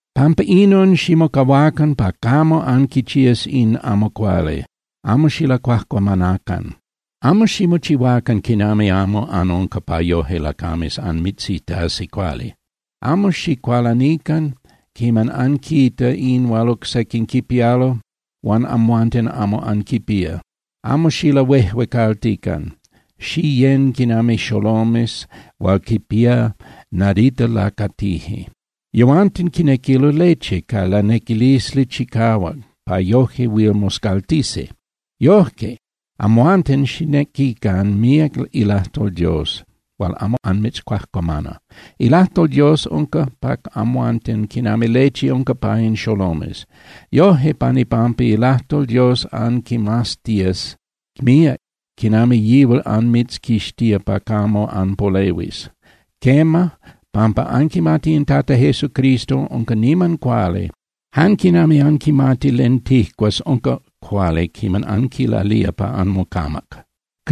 Pampa inon, ximocahuacan pa camo anquichías in amo cuali, amo xilacuajcuamanacan. Amo ximochihuacan quinami amo anunca pa yoje lacames anmitzitasi cuali. Amo xicualanican quiman anquita in hual oc sequin quipialo huan amhuanten amo anquipía, amo xilahuejuecaltican. Xiyén (Xiyecan) quinami xolomes hual quipía nadita lacatije. Yehuanten quinequilo leche ca lanequilisli chicahuac pa yoje huil moscaltisi. Yoje, amhuanten xicnequican míac ilajtol Dios hual amo anmitzcuajcuamana. Ilajtol Dios unca pa amhuanten quinami leche unca pa in xolomes. Yoje, pan ipampa ilajtol Dios anquimaztías míac quinami yihual anmitzquixtía pa camo anpolehuis. Quema, pampa anquimati in Tata Jesucristo unca niman cuali, jan quinami anquimati len tijcuas unca cuali quiman anquilalía pa anmocamac.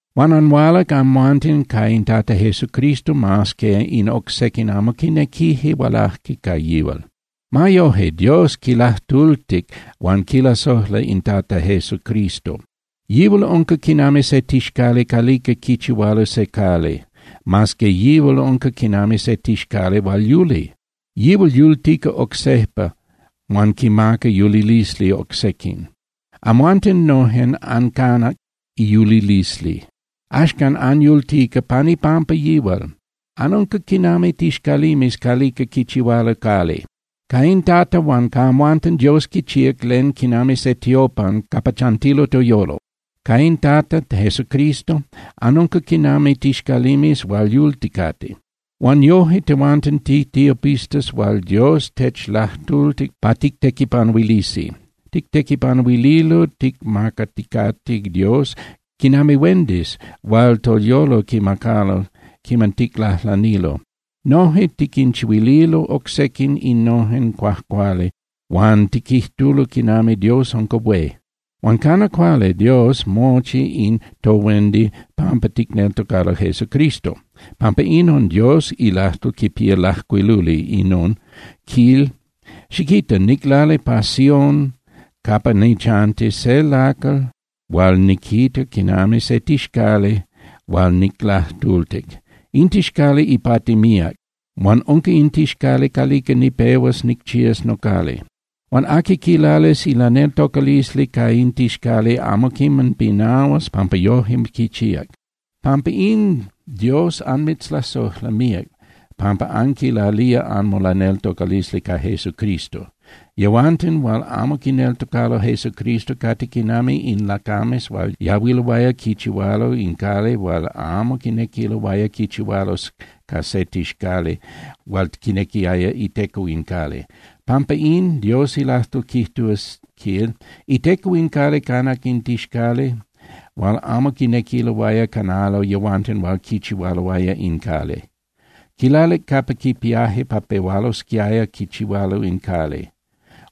Huan anhualac amhuanten ca in Tata Jesucristo mas que in oc sequin amo quinequije hualaje ca yihual. Ma yoje, Dios quilajtultic huan quilasojla in Tata Jesucristo. Yihual unca quinami se tixcali calica quichihualo se cali, mas que yihual unca quinami se tixcali hual yuli. Yihual yultica oc sejpa huan quimaca yulilisli oc sequin. Amhuanten nojen ancanac iyulilisli. Axcan anyultica pan ipampa yihual. Anunca quinami tixcalimes calica quichihualo cali. Ca in Tata huan ca amhuanten Dios quichíac len quinami se tiopan capa chantilo toyolo. Ca in Tata Jesucristo anunca quinami tixcalimes hual yulticate. Huan yoje tehuanten titiopistas hual Dios techlajtultic pa tictequipanuilisi. Tictequipanuililo ticmacaticate Dios quinami huendis hual toyolo quimacalo quiman ticlajlanilo. Noje tiquinchihuililo oc sequin innojen cuajcuali huan tiquijtulo quinami Dios unca hué. Huan cana cuali Dios mochi in tohuendi pampa ticneltocalo Jesucristo. Pampa inon, Dios ilajtol quipía lajcuiluli inon, quil: Xiquita, niclalic pa Sión capa nichanti se lacal hual niquita quinami se tixcali hual niclajtultic. In tixcali ipati míac, huan unca in tixcali calica nipehuas nicchías nocali. Huan aqui quilalis ilaneltocalisli ca in tixcali amo quiman pinahuas pampa yoje quichíac. Pampa in, Dios anmitzlasojla míac pampa anquilalía anmolaneltocalisli ca Jesucristo. Yehuanten hual amo quineltocalo Jesucristo cate quinami in lacames hual yahuiloaya quichihualo in cali huan amo quinequiloaya quichihualo ca se tixcali hual quinequiaya iteco in cali. Pampa in, Dios ilajtol quijtúa, quil: Iteco in cali canac in tixcali hual amo quinequiloaya canalo yehuanten hual quichihualoaya in cali. Quilalic capa quipiaje pa pehualosquiaya quichihualo in cali.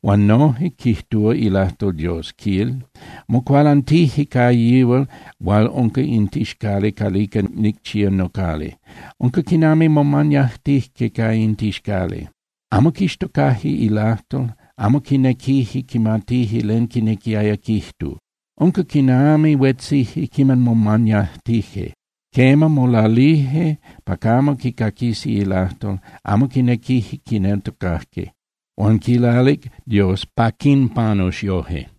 Huan noje quijtúa ilajtol Dios, quil: Mocualantije ca yihual hual unca in tixcali calica nicchía nocali, unca quinami momañajtije ca in tixcali. Amo quixtocaje ilajtol, amo quinequije quimatije len quinequiaya quijtu, unca quinami huetzije quiman momañajtije. Quema, molalije pa camo quicaquisi ilajtol, amo quinequije quineltocaje. Huan quilalic Dios pa quinpanus yoje.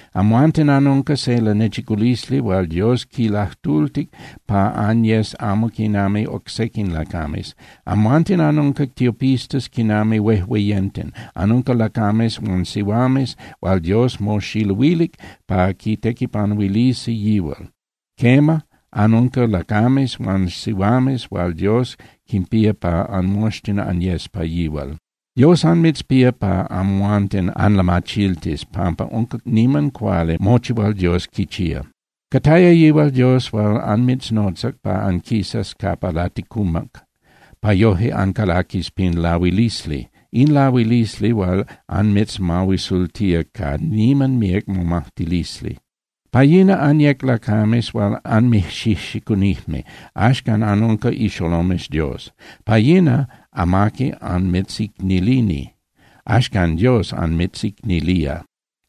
Amhuanten anunca se lanechiculisli hual Dios quilajtultic pa anyes amo quinami oc sequin lacames. Amhuanten anunca tiopistas quinami huejueyenten, anunca lacames huan sihuames hual Dios moxiluilic pa quitequipanuilisi yihual. Quema, anunca lacames huan sihuames hual Dios quinpía pa anmoxtin anyes pa yihual. Dios anmitzpía pa amhuanten anlamachiltis pampa unca niman cuali mochi hual Dios quichía. Cataya yihual Dios hual anmitznotzac pa anquisas capa laticumac pa yoje ancalaquis pin lahuilisli, in lahuilisli hual anmitzmahuisultía ca niman míac momajtilisli. Pa yina anyec lacames hual anmijxijxicunijme, axcan anunca ixolomes Dios. Pa yina amaqui anmitzicnilini. Axcan Dios anmitzicnilía.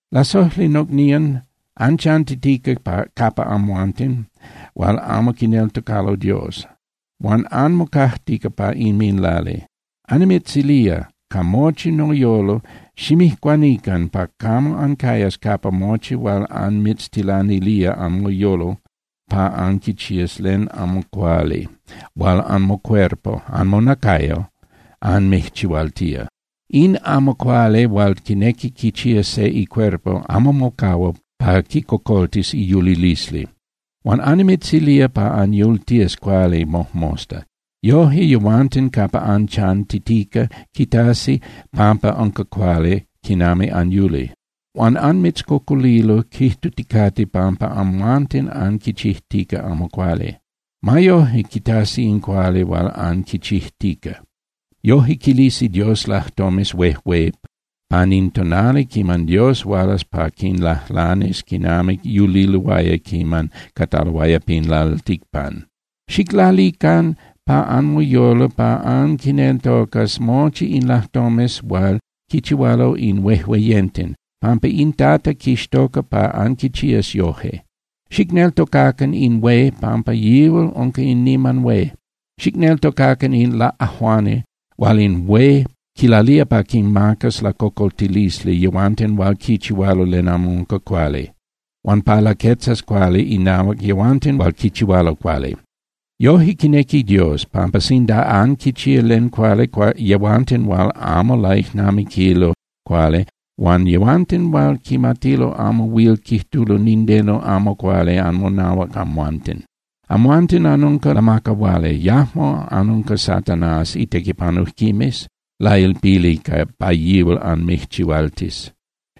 Lasojli nocnían, anchantitica capa yehuanten hual amo quineltocalo Dios, huan anmocajtica pa inminlali. Annimitzilía, ca mochi noyolo, ximijcuanican pa camo ancayas capa mochi hual anmitztilanilía anmoyolo pa anquichías len amo cuali hual anmocuerpo (anmonacayo) anmijchihualtía. In amo cuali hual quinequi quichía se icuerpo amo mocahua pa quicocoltis iyulilisli. Huan annimitzilía pa anyultías cuali mojmosta. Yoje yehuanten capa anchantitica quitasi pampa unca cuali quinami anyuli. Huan anmitzcocolilo, quijtuticate pampa amhuanten anquichijtica amo cuali. Ma yoje quitasi in cuali hual anquichijtica. Yoje quilisi Dios lajtomes huejué pan in tonali quiman Dios hualas pa quinlajlanis quinami yuliloaya quiman cataloaya pan lalticpan. Xiclalican pa anmoyolo pa anquineltocas mochi in lajtomes hual quichihualo in huejueyenten, pampa in Tata quixtoca pa anquichías yoje. Xicneltocacan in hué pampa yihual unca in niman hué. Xicneltocacan in laꞌajuani hual in hué quilalía pa quinmacas lacocoltilisli yehuanten hual quichihualo len amo unca cuali, huan pa laquetzas cuali inahuac yehuanten hual quichihualo cuali. Yoje quinequi Dios, pampa sinda anquichía len cuali, yehuanten hual amo laijnamiquilo cuali huan yehuanten hual quimatilo amo huil quijtulo nindeno amo cuali anmonahuac amhuanten. Amhuanten anunca lamacahuali, yajmo anunca Satanás itequipanujquimes lailpili pa yihual anmijchihualtis.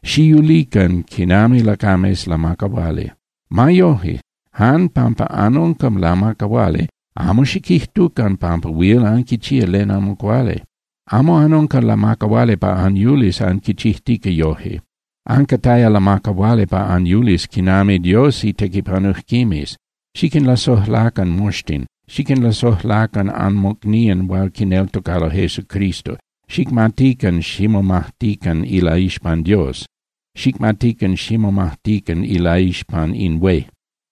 Xiyulican quinami lacames lamacahuali. Ma yoje, jan pampa anunca lamacahuali, amo xiquijtucan pampa huil anquichía len amo cuali. Amo anunca lamacahuali pa anyulis anquichijtica yoje. Ancataya lamacahuali pa anyulis quinami Dios itequipanujquimes. Xiquinlasojlacan moxtin, xiquinlasojlacan anmocnían hual quineltocalo Jesucristo, xicmatican ximomajtican ilaixpan Dios, xicmatican ximomajtican ilaixpan in hué.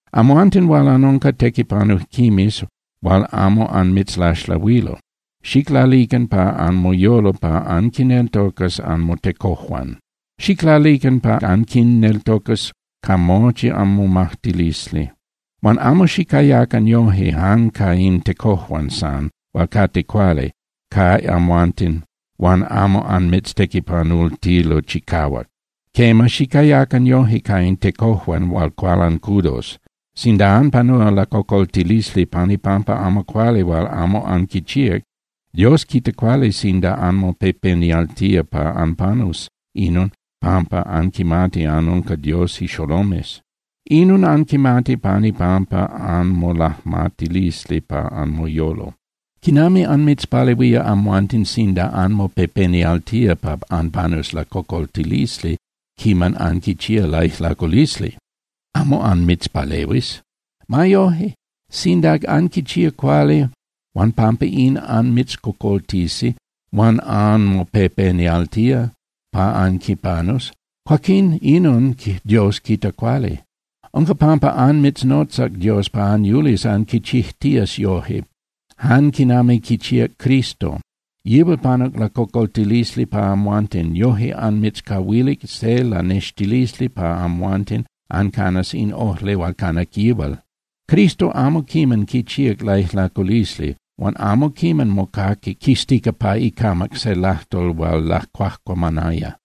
Amhuanten hual anunca tequipanujquimes hual amo anmitzlaxlahuilo, xiclalican pa anmoyolo pa anquineltocas anmotecojuan. Xiclalican pa anquinneltocas ca mochi anmomajtilisli. Huan amo xicayacan yoje jan ca in tecojuan san hual cate cuali ca amhuanten huan amo anmitztequipanultilo chicahuac. Quema, xicayacan yoje ca in tecojuan hual cualancudos. Sinda anpanúa lacocoltilisli pan ipampa amo cuali hual amo anquichíac, Dios quita cuali sinda anmopepenialtía pa anpanus inon pampa anquimati anunca Dios ixolomes. Inon anquimati pan ipampa anmolajmatilisli pa anmoyolo. ¿Quinami anmitzpalehuía amhuanten sinda anmopepenialtía pa anpanus lacocoltilisli quiman anquichía laijlaculisli? Amo anmitzpalehuis. Ma yoje, sinda anquichía cuali huan pampa in anmitzcocoltisi huan anmopepenialtía pa anquipanus, cuaquín inon Dios quita cuali. Unca pampa anmitznotzac Dios pa anyulis anquichijtías yoje, jan quinami quichíac Cristo. Yihual panuc lacocoltilisli pa amhuanten, yoje anmitzcahuilic se lanextilisli pa amhuanten ancanas in ojli hual canac yihual. Cristo amo quiman quichíac laijlaculisli huan amo quiman mocaquic quistica pa icamac se lajtol hual lacuajcuamanaya.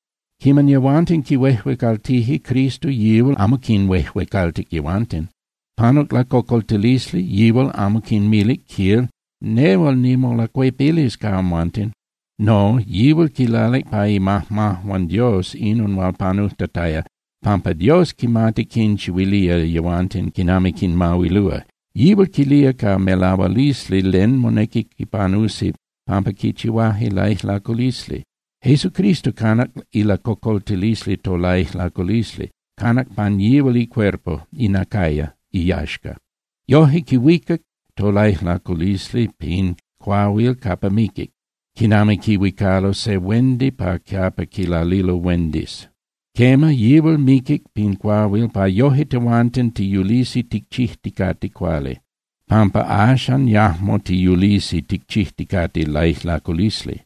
Quiman yehuanten quihuejuecaltije Cristo, yihual amo quinhuejuecaltic yehuanten. Panuc lacocoltilisli, yihual amo quinmilic, quil: “Nehual nimolacuepilis ca amhuanten.” No, yihual quilalic pa imajmajuan Dios inon hual panujtataya pampa Dios quimati quinchihuilía yehuanten quinami quinmahuilúa. Yihual quilía ca melahualisli len monequi quipanusi pampa quichihuaje laijlaculisli. Jesucristo canac ilacocoltilisli tolaijlaculisli, canac pan yihual icuerpo (inacayo) iyaxca. Yoje quihuicac tolaijlaculisli pin cuahuil capa miquic, quinami quihuicalo se huendi pa capa quilalilo huendis. Quema, yihual miquic pin cuahuil pa yoje tehuanten tiyulisi ticchijticate cuali, pampa axan yajmo tiyulisi ticchijticate laijlaculisli.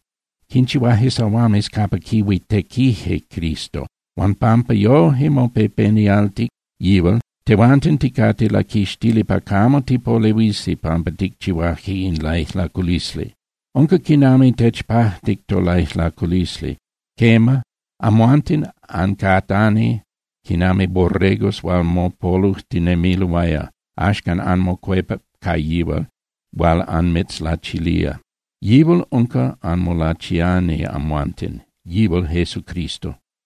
Quinchihuaje sahuames capa quihuitequije Cristo. Huan pampa yoje mopepenialtic yihual, tehuanten ticate laquixtili pa camo tipolehuisi pampa ticchihuaje in laijlaculisli. Unca quinami techpajtic tolaijlaculisli. Quema, amhuanten ancatani quinami borregos hual mopolujtinemiloaya. Axcan anmocuepac ca yihual hual anmitzlachilía. Yihual unca anmolachiani amhuanten, yihual Jesucristo.